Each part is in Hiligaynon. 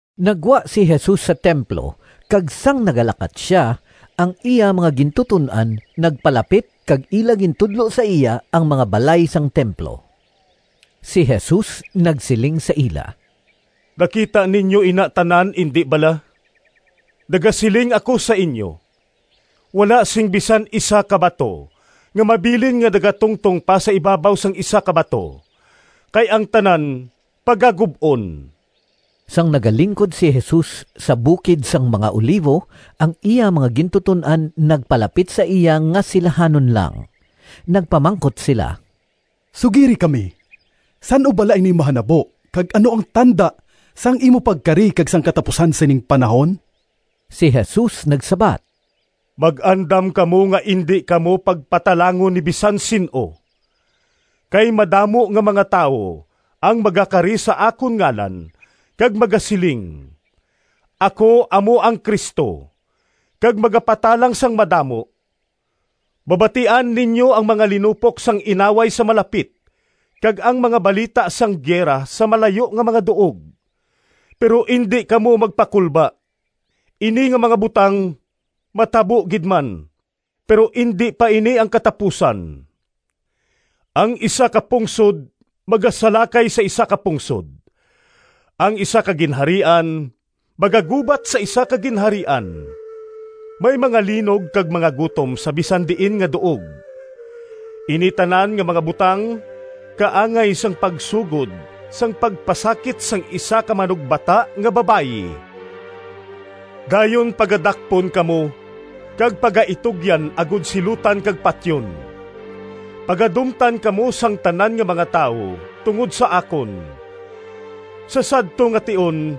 Naggwa si Jesus sa templo kag sang nagalakat sia, ang iya mga gintuton-an nagpalapit kag ila gintudlo sa iya ang mga balay sang templo. Si Jesus nagsiling sa ila, “Nakita ninyo ina tanan, indi bala? Nagasiling ako sa inyo, wala sing bisan isa ka bato nga mabilin nga nagatungtong pa sa ibabaw sang isa ka bato, kay ang tanan pagagub-on.” Sang nagalingkod si Jesus sa bukid sang mga Olivo, ang iya mga gintuton-an nagpalapit sa iya nga silahanon lang. Nagpamangkot sila, “Sugiri kami, san-o bala ini mahanabo kag ano ang tanda sang imo pagkari kag sang katapusan sining panahon?” Si Jesus nagsabat, “Mag-andam kamo nga indi kamo pagpatalangon ni bisan sin-o, kay madamo nga mga tawo ang magakari sa akon ngalan kag magasiling, ‘Ako amo ang Cristo!’ kag magapatalang sang madamo. Mabatian ninyo ang mga linupok sang inaway sa malapit kag ang mga balita sang gira sa malayo nga mga duog, pero indi kamo magpakulba. Ini nga mga butang matabo gid man pero indi pa ini ang katapusan. Ang isa ka pungsod magasalakay sa isa ka pungsod, ang isa ka ginharian magagubat sa isa ka ginharian. May mga linog kag mga gutom sa bisan diin nga duog. Ini tanan nga mga butang kaangay sang pagsugod sang pagpasakit sang isa ka manugbata nga babayi. “Dayon pagadakpon kamo kag pagaitugyan agod silutan kag patyon. Pagadumtan kamo sang tanan nga mga tawo tungod sa akon. Sa sadto nga tion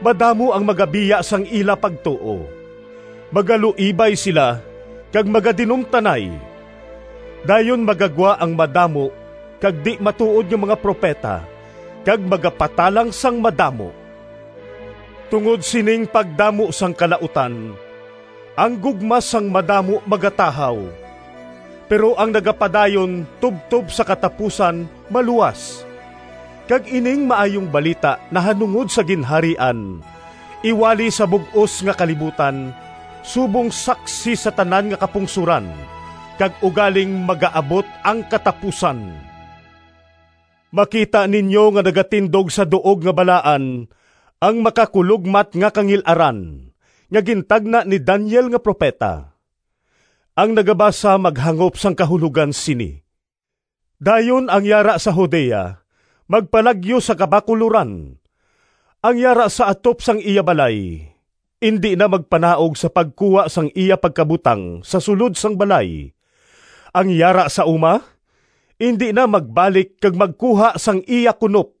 madamo ang magabiya sang ila pagtuo; magaluibay sila kag magadinumtanay. Dayon magagwa ang madamo kag di-matuod nga mga propeta kag magapatalang sang madamo. Tungod sining pagdamo sang kalautan ang gugma sang madamo magatahaw. Pero ang nagapadayon tubtob sa katapusan maluwas. Kag ining Maayong Balita nahanungod sa Ginharian iwali sa bug-os nga kalibutan, subong saksi sa tanan nga kapungsoran, kag ugaling magaabot ang katapusan.” “Makita ninyo nga nagatindog sa duog nga balaan ‘Ang Makakulogmat nga Kangil-aran,’ nga gintagna ni Daniel nga propeta.” (Ang nagabasa maghangop sang kahulogan sini!) “Dayon ang yara sa Judea magpalagyo sa kabakuloran. Ang yara sa atop sang iya balay indi na magpanaog sa pagkuha sang iya pagkabutang sa sulod sang balay. Ang yara sa uma indi na magbalik kag magkuha sang iya kunop.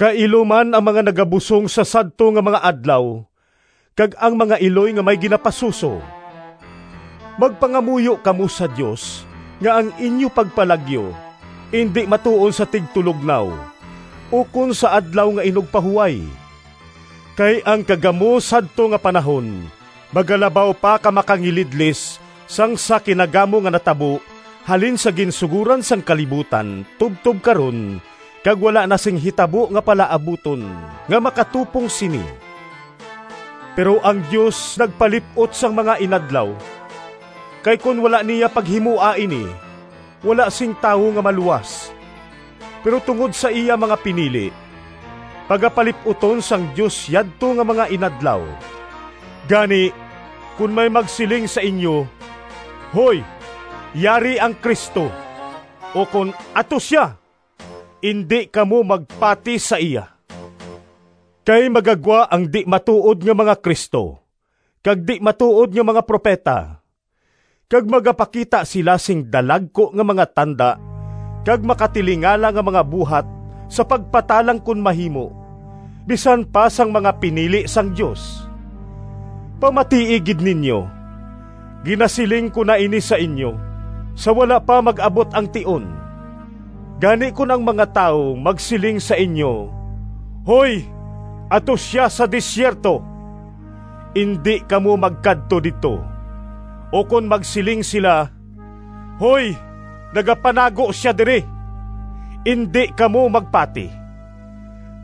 Kailo man ang mga nagabusong sa sadto nga mga adlaw, kag ang mga iloy nga may ginapasuso! Magpangamuyo kamo sa Dios nga ang inyo pagpalagyo indi matuon sa tigtulognaw ukon sa Adlaw nga Inugpahuway! Kay ang kagamo sadto nga panahon magalabaw pa ka makangilidlis sang sa kinagamo nga natabo halin sa ginsugoran sang kalibutan tubtob karon, kag wala na sing hitabo nga palaabuton nga makatupong sini. Pero ang Dios nagpalip-ot sang mga inadlaw, kay kon wala niya paghimoa ini wala sing tawo nga maluwas. Pero tungod sa iya mga pinili, pagapalip-uton sang Dios yadto nga mga inadlaw. “Gani, kon may magsiling sa inyo, ‘Hoy, yari ang Cristo!’ ukon ‘Ato sia!’—indi kamo magpati sa iya. Kay magagwa ang di-matuod nga mga Cristo, kag di-matuod nga mga propeta, kag magapakita sila sing dalagku nga mga tanda kag makatilingala nga mga buhat sa pagpatalang kon mahimo, bisan pa sang mga pinili sang Dios. Pamatii gid ninyo! Ginasiling ko na ini sa inyo, sa wala pa mag-abot ang tion. “Gani kon ang mga tawo magsiling sa inyo, ‘Hoy, ato sia sa desierto!’—indi kamo magkadto didto; ukon magsiling sila, ‘Hoy, nagapanago sia diri!’—indi kamo magpati.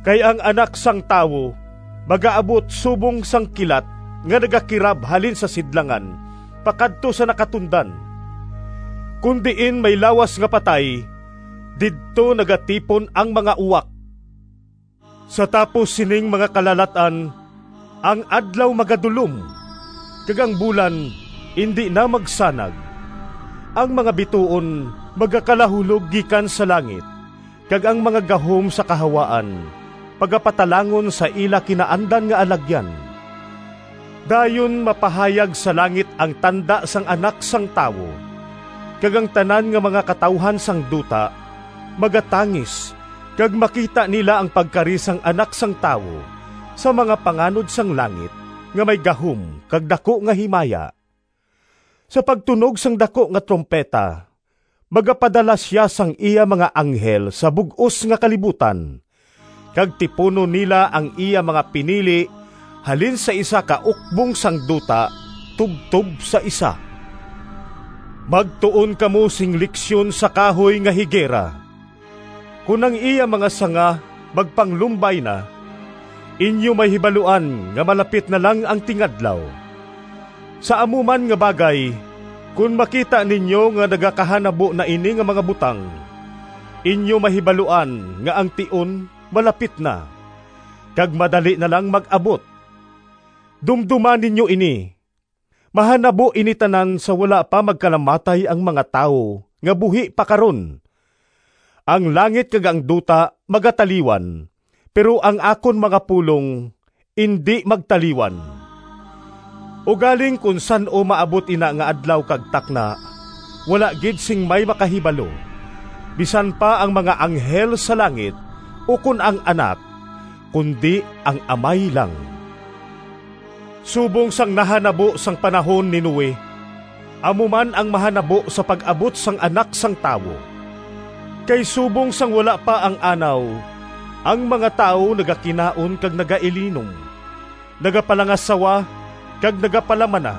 Kay ang Anak sang Tawo magaabot subong sang kilat nga nagakirab halin sa sidlangan pakadto sa nakatundan. “Kon diin may lawas nga patay, didto nagatipon ang mga uwak.” “Sa tapos sining mga kalalat-an, ang adlaw magadulom, kag ang bulan indi na magsanag, ang mga bituon magakalahulog gikan sa langit, kag ang mga gahom sa kahawaan pagapatalangon sa ila kinaandan nga alagyan. Dayon mapahayag sa langit ang tanda sang Anak sang Tawo, kag ang tanan nga mga katawuhan sang duta magatangis kag makita nila ang pagkari sang Anak sang Tawo sa mga panganod sang langit nga may gahom kag daku nga himaya. Sa pagtunog sang daku nga trumpeta magapadala sia sang iya mga anghel sa bug-os nga kalibutan, kag tipunon nila ang iya mga pinili halin sa isa ka ukbong sang duta tubtob sa isa.” “Magtuon kamo sing leksyon sa kahoy nga higera. Kon ang iya mga sanga magpanglumbay na, inyo mahibaluan nga malapit na lang ang tingadlaw. Sa amo man nga bagay, kon makita ninyo nga nagakahanabo na ini nga mga butang, inyo mahibaluan nga ang tion malapit na, kag madali na lang mag-abot. Dumdoma ninyo ini! Mahanabo ini tanan sa wala pa magkalamatay ang mga tawo nga buhi pa karon. Ang langit kag ang duta magataliwan, pero ang akon mga pulong indi magtaliwan.” “Ugaling kon san-o maabot ina nga adlaw kag takna, wala gid sing may makahibalo, bisan pa ang mga anghel sa langit, ukon ang Anak, kundi ang Amay lang. Subong sang nahanabo sang panahon ni Noe, amo man ang mahanabo sa pag-abot sang Anak sang Tawo. Kay subong sang wala pa ang Anaw, ang mga tawo nagakinaon kag nagailinom, nagapalangasawa kag nagapalamana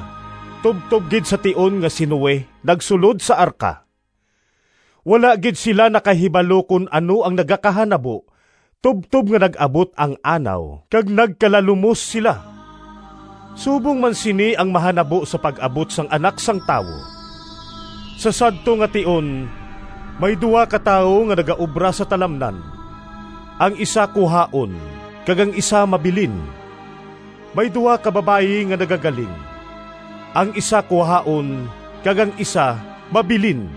tubtob gid sa tion nga si Noe nagsulod sa arka. Wala gid sila nakahibalo kon ano ang nagakahanabo tubtob nga nag-abot ang Anaw kag nagkalalumos sila. Subong man sini ang mahanabo sa pag-abot sang Anak sang Tawo. Sa sadto nga tion may duha ka tawo nga nagaobra sa talamnan: ang isa kuhaon, kag ang isa mabilin. May duha ka babayi nga nagagaling: ang isa kuhaon, kag ang isa mabilin.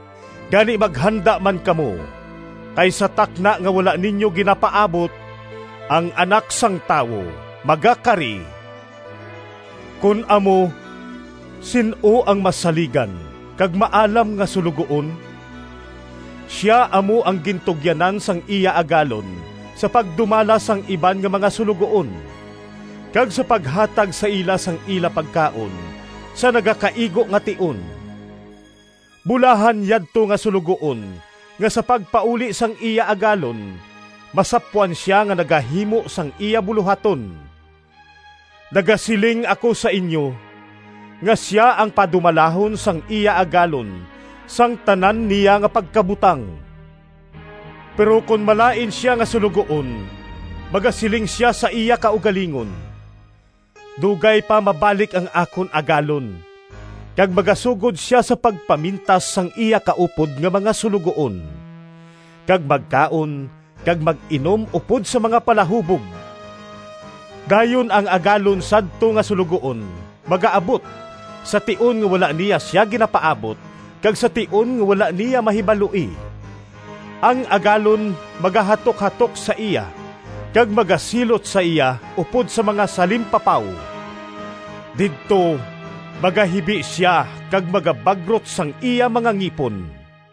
Gani maghanda man kamo, kay sa takna nga wala ninyo ginapaabot, ang Anak sang Tawo magakari.” “Kon amo, sin-o ang masaligan kag maalam nga suloguon? Sia amo ang gintugyanan sang iya agalon sa pagdumala sang iban nga mga suloguon, kag sa paghatag sa ila sang ila pagkaon sa nagakaigo nga tion. Bulahan yadto nga suloguon nga sa pagpauli sang iya agalon masapwan sia nga nagahimo sang iya bulohaton! Nagasiling ako sa inyo, nga sia ang padumalahon sang iya agalon sang tanan niya nga pagkabutang. Pero kon malain sia nga suloguon magasiling sia sa iya kaugalingon, ‘Dugay pa mabalik ang akon agalon,’ kag magasugod sia sa pagpamintas sang iya kaupod nga mga suloguon, kag magkaon kag mag-inom upod sa mga palahubog. Dayon ang agalon sadto nga suloguon magaabot sa tion nga wala niya sia ginapaabot kag sa tion nga wala niya mahibaloi. Ang agalon magahatukhatok sa iya kag magasilot sa iya upod sa mga salimpapaw. Didto magahibi sia kag magabagrot sang iya mga ngipon.”